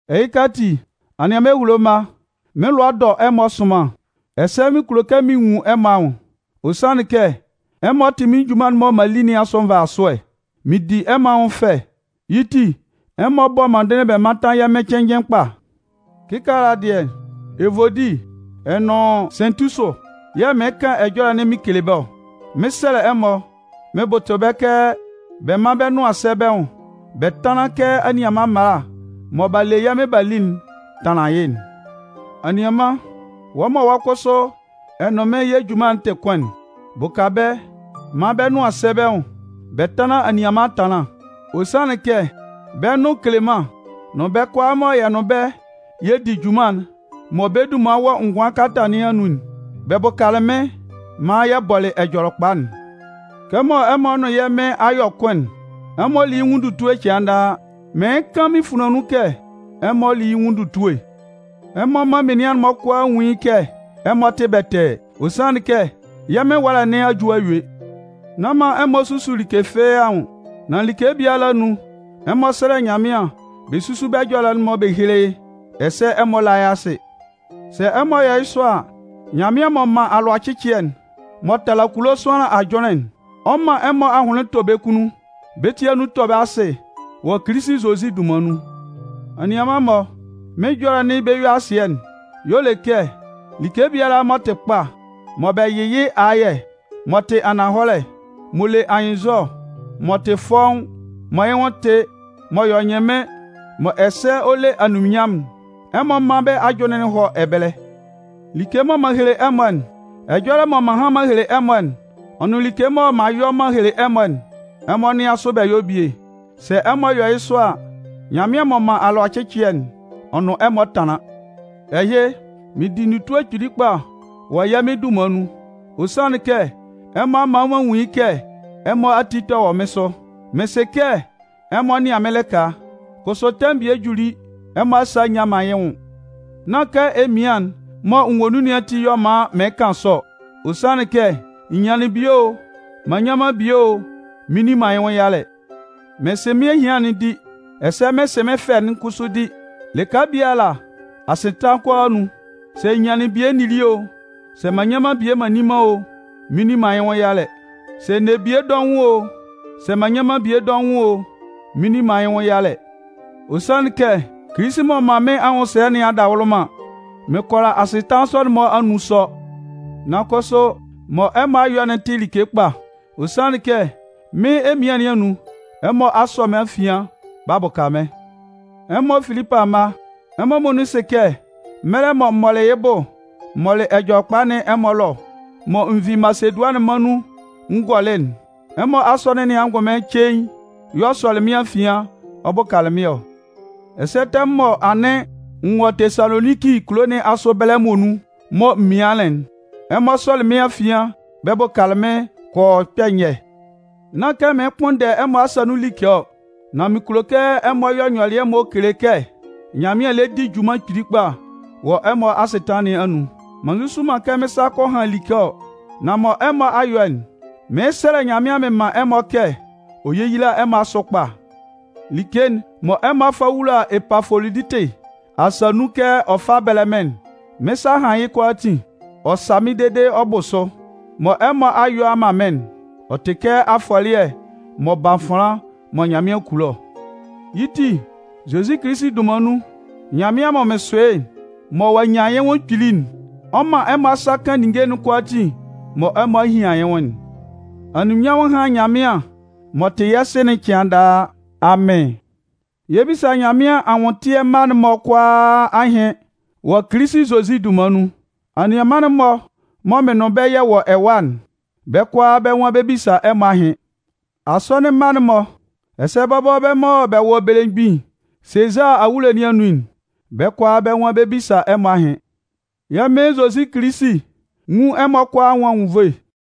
Ɛhɩka ati, anianman ehulo mma, mɩ́n lʋa dɔ ɛmɔ sʋnman, ɛsɛ mɩn kulo kɛ mɩn nwun ɛmɔ anwʋn. Ɔ sanlɩn kɛ, ɛmɔ tɩ mɩ́n junman'n mɔ m'an li nɩn asʋ nvasʋɛ. Mɩn di ɛmɔ anwʋn fɛ. Yɩ́ ti, ɛmɔ bɔ́ mɔndɩnlɩn bɛ mántan yɛ́ Mɩn cɩnnjɩn kpa. Kɩkaala dɩɛ, Evodi ɔ nʋn Sɩntisʋ yɛ̂ mɩɩn kan ɛjɔlɛ'n mɩn kele bɛ́ ɔ. Mɩn 'sɛlɛ ɛmɔ mɩn bʋtʋ bɛ́ kɛ bɛ mán bɛ́ nʋan sɛ́ bɛ́ nwʋn bɛ tánlan kɛ anianman mmala mɔ b'a le yɛ́ Mɩn b'a li'n tanlan yɩ́'n. Anianman, wɔ́ mɔ wɔ́ kʋsʋ ɛ nʋn mɩ́n yɛ́ junman'n tɩ kʋn'n, bʋka bɛ́ maan bɛ́ nʋan sɛ́ bɛ́ nwʋn bɛ tánlan anianman ɛtanlán. Ɔ sanlɩn kɛ, bɛ́ nʋn Keleman nʋn bɛ́ kʋalaa mɔ yɛ nʋn bɛ́ yɛ di junman'n mɔ bɛ́ dunman wɔ ngʋan kalata nɩn anun'n, bɛ bʋkalɩ mɩ́n maan yɛ bɔlɩ Ɛjɔlɛkpa'n. Kɛmɔ ɛmɔ nʋn yɛ́ Mɩn a yɔ kʋn'n, ɛmɔ lí yɩ́ nwʋn ndutue cɩan daa. Mɩɩn kan mɩn funlan nun kɛ ɛmɔ lí yɩ́ nwʋn ndutue! Ɛmɔ mán menian'n-mɔ kʋalaa nwún yɩ́ kɛ ɛmɔ tɩ bɛtɛɛ. Ɔ sanlɩn kɛ yɛ́ Mɩn ɛwalɛ nɩn a ju a yue. Nán man ɛmɔ susu like fɩ́ɩ́ anwʋn, nan like biala anun, ɛmɔ sɛ́lɛ Nyanmɩan bɛ súsu bɛ́ ɛjɔlɛ'n bɛ héle yɩ́, ɛsɛ ɛmɔ lá yɩ́ asɩ. Sɛ ɛmɔ yɔ yɩ́ sɔ a, Nyanmɩan m'ɔ man alʋacɩcɩɛ'n mɔ tala kulo sʋanlan ajʋnlɩn'n, ɔ 'man ɛmɔ ahʋnlɩn tɔ bɛ́ kunnun, bɛ́ ti anun tɔ bɛ asɩ wɔ Kilisi Zozi dunman nun. Anianman-mɔ, mɩ́n ɛjɔlɛ'n be-yue-asɩɛ'n y'ɔ le kɛ like biala m'ɔ tɩ kpa, mɔ bɛ yɩ́ ayɛ, m'ɔ tɩ ananhɔlɛ, m'ɔ le anyɩnnzɔ, m'ɔ tɩ fɔ́ʋ́n, mɔ yɩ́ nwʋn tɩ, m'ɔ yɔ ɛnyɩnmɩn mɔ ɛsɛ ɔ le anunminnyanmʋn'n, ɛmɔ mán bɛ́ ajʋnlɩn'n hɔ́ ɛbɛlɛ. Like mɔ m'an hehele ɛmɔ'n, ɛjɔlɛ mɔ m'an han m'an hele ɛmɔ'n, ɔ nʋn like mɔ m'an yɔ m'an hele ɛmɔ'n, ɛmɔ nɩ́an sʋ bɛ yɔ́ bie. Sɛ ɛmɔ yɔ yɩ́ sɔ a, Nyanmɩan m'ɔ man alʋacɩcɩɛ'n, ɔ nʋn ɛmɔ 'tanlan. Ɛhɩ, mɩn di ndutue kpili kpa wɔ yɛ́ Mɩn dunman nun. Ɔ sanlɩn kɛ ɛmɔ a man m'an nwun yɩ́ kɛ ɛmɔ ati tɛ wɔ mɩ́n sʋ. Mɩn sɩ kɛ ɛmɔ nɩan mɩ́n lɩka, kʋsʋ tɛmʋn bie juli, ɛmɔ asa a nyan man yɩ́ nwʋn. Nán kɛ emian'n mɔ n wɔ nun nɩn ati y'ɔ man mɩɩn kan sɔ ɔ. Ɔ sanlɩn kɛ n nyanlɩn bie o, m'an nnyan man bie o, mɩn nni man yɩ́ nwʋn yalɛ. Mɩn sɩ mɩ́n ehian'n di, ɛsɛ mɩn sɩ mɩ́n fɛ'n kʋsʋ di. Lɩka biala, asɩtanlan kʋalaa anun, sɛ n nyanlɩn bie n nili o, sɛ m'an nnyan man bie m'an nni man o, mɩn nni man yɩ́ nwʋn yalɛ. Sɛ n ne bie dɔʋn o, sɛ nne man bie dɔʋn o, mɩn nni man yɩ́ nwʋn yalɛ. Ɔ sanlɩn kɛ Kilisi m'ɔ man mɩ́n anwʋnsɛlɛ nɩn adawʋlʋman, mɩn kʋala asɩtanlan sɔ'n-mɔ anun sɔ. Nan kʋsʋ, mɔ ɛmɔ a yɔ'n tɩ like kpa, ɔ sanlɩn kɛ mɩ́n emian nɩn anun, ɛmɔ a sɔ mɩ́n afian b'a bʋka mɩ́n. Ɛmɔ Filipʋ amma, ɛmɔ muonun sɩ kɛ mɛlɛ mɔ m mɔlɩ yɩ́ bʋ m mɔlɩ Ɛjɔlɛkpa nɩn ɛmɔ ɛlɔ, mɔ n vi Masedʋanɩn mân nun n gɔlɩ'n, ɛmɔ Asɔnɩn nɩn angʋnmɩn cein y'ɔ sɔlɩ mɩ́n afian ɔ bʋkalɩ mɩ́n ɔ. Ɛsɛ tɛmʋn mɔ anɩn n wɔ Tesaloninki kulo nɩn asʋ ɛbɛlɛ'n muonun mɔ m mianlɩn'n, ɛmɔ sɔlɩ mɩ́n afian bɛ bʋkalɩ mɩ́n kɔ yɔ kpɛ̂ nyɛ. Nán kɛ mɩɩn kpʋnndɛ ɛmɔ asa nun like ɔ, nan mɩn kulo kɛ ɛmɔ yɔ nyɔlɩɛ mɔ kele kɛ Nyanmɩan lɛ di junman kpili kpa wɔ ɛmɔ asɩtanlan nɩn anun. M'an nzuzu man kɛ mɩn sa kɔ han like ɔ. Nan mɔ ɛmɔ a yɔ'n, mɩɩn sɛlɛ Nyanmɩan mɩn man ɛmɔ kɛ ɔ yéyila ɛmɔ asʋ kpa. Like'n mɔ ɛmɔ a fa wula Epafoloditɩ asa nun kɛ ɔ fá bɛ́lɛ mɩ́n'n, mɩ́n sa a han yɩ́ kʋalaatin. Ɔ sa mɩ́n dede ɔ bʋ sʋ. Mɔ ɛmɔ a yɔ a man mɩ́n'n, ɔ tɩ kɛ afɔlɩɛ m'ɔ ban fanlan mɔ Nyanmɩan kulo ɔ. Yɩ́ ti, Zozi Kilisi dunman nun, Nyanmɩan mɔ mɩn sʋ yɩ́, mɔ ɔ'a nyan yɩ́ nwʋn kpili'n, ɔ 'man ɛmɔ asa kan ninnge'n kʋalaatin mɔ ɛmɔ a hian yɩ́ nwʋn'n. Anunminnyanmʋn hán Nyanmɩan m'ɔ tɩ yɛ́ Sɩ'n cɩan daa. Amɩn. Yɛ 'bisa Nyanmɩan anwʋntɩɛ mma'n-mɔ kʋalaa ahɩn wɔ Kilisi Zozi dunman nun. Anianman'n-mɔ mɔ mɩ́n nʋn bɛ́ yɛ wɔ ɛwa'n, bɛ́ kʋalaa bɛ́ nwan bɛ 'bisa ɛmɔ ahɩn. Asɔnɩn mma'n-mɔ, ɛsɛ bɔbɔ bɛ́ mɔ bɛ wɔ belemgbin Sezaa awulo nɩn anun'n, bɛ́ kʋalaa bɛ́ nwan bɛ 'bisa ɛmɔ ahɩn. Yɛ́ Mɩn Zozi Kilisi nwún ɛmɔ kʋalaa anwʋn anwunnvoe.